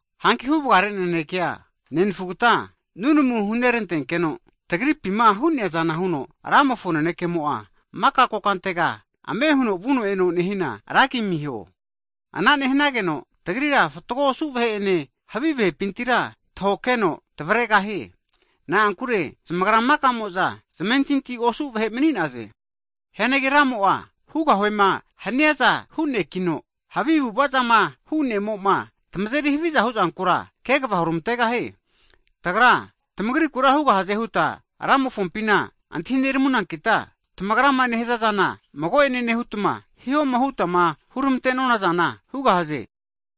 Hanki huvagare nanekea, nenfugata nunamu hunerantenkeno, tamagripima hu'neazana huno Ramofo nanekemo'a, maka kokantega ame huno vuno e'no nehina, ragi amiho. Ana nehanageno, tagrira fatgo osu vahe'ene havi vahepintira tahokeno tavregahie. Na'ankure zamagra maka'mo'za zamentinti osu vahe mani'naze. Hianagi Ramo'a hugahuema haniaza hu'nekino, havi avu'avazama nehia ne'mo'ma tamazeri haviza huzankura kegava huramantegahie. Tagra, tamagrikura hugahaze huta Ramofompina antahineramunankita, tamagrama nehazazana mago'ene nehutma, hihoma hutama huramante'nonazana hugahaze.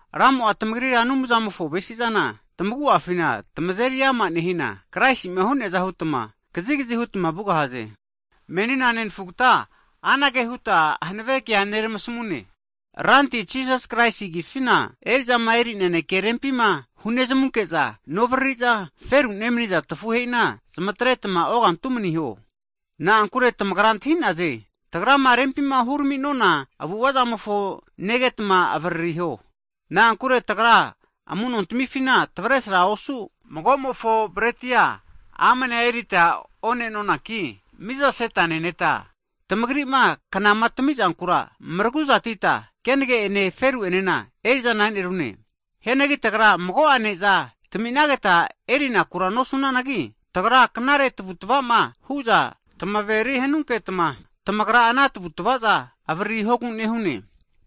Ramo'a tamagrira Anumzamofo avesizana tamagu'afina eriama nehina, Kraisi'ma hu'neaza hutma kazigazi hutma vugahaze. Hagi menina nenafugata anage huta hanave kea neramasamune, Ranti Jisas Kraisi agifina, eri'zama eri naneke rempima hunezamunke'za novariri'za, feru nemaniza tafuhe'ina zmatretma ogantu maniho. Na'ankure tamagra antahinaze, tagrama rempima hurami'nona avu'avazamofo negetma avaririho. Na'ankure tagra amu'nontamifima tavesrama osu, magomofo bretia amanea erita o'nenonanki mizaseta neneta, tamagrima knama tamizankura maraguzatita hanine zagenena erizana e'nerune. Hianagi tagra mago'a neza taminageta e'rinakura nosunanagi, tagra knare tavutavama huza tamaveri hanunketma, tamagra ana tavu'tavaza avaririhogu anara nehune.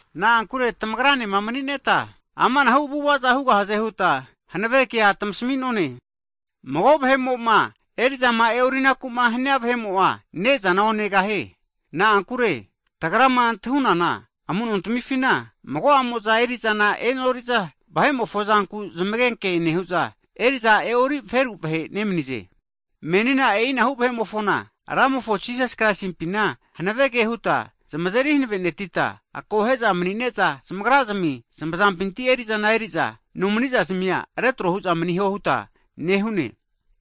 Na'ankure tamagranema manineta, amanahu avu'avaza hugahaze huta hanave kea tamasami'none. Mago vahe'mo'ma eri'zama e'orinakuma hania vahe'mo'a, ne'zana onegahie. Na'ankure tagrama antahunana amu'nontamifina mago'amo'za erizana e'noriza, vahe'mofo zanku zamagenke nehu'za, eri'za e'ori feru vahe nemanize. Menina e'inahu vahe'mofona, Ramofo Jisas Kraisimpina hanavege huta zamazeri hanave'netita, akohe'za mani'ne'za zamagrazmi zamazampinti erizana eri'za, nomanizazmia retro hu'za maniho huta nehune.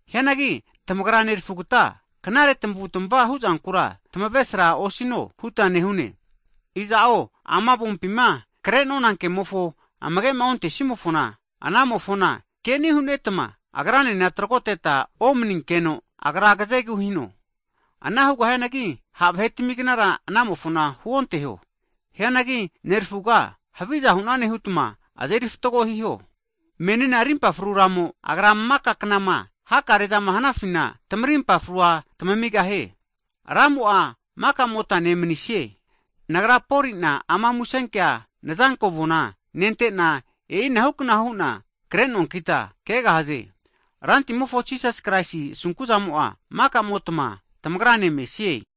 Hianagi tamagra nerafugata, knare tamavu'tmavama huzankura tamavesra osino huta nehune. Iza'o ama avompima kre'nona kemofoma amagema ontesimofona, anamofona keni hunetama, agranena tragoteta omaninkeno agra agazegu hino. Hugahianagi, ha vahetamignara anamofona huonteho, hianagi nerafuga haviza hunane hutma azeri fatgo hiho. Menina rimpa fru Ramo, Agra'a maka knama hakare'zama hanafina, tamarimpa frua tamigahie. Ramo'a makamotane manisie. Nagra'a Polina ama musenkea nazanko avona nentena, e'inahukna hu'na krenoankita kegahaze. Rantimofo Jisas Kraisi asunkuzamo'a makamotma tamagrane mesie.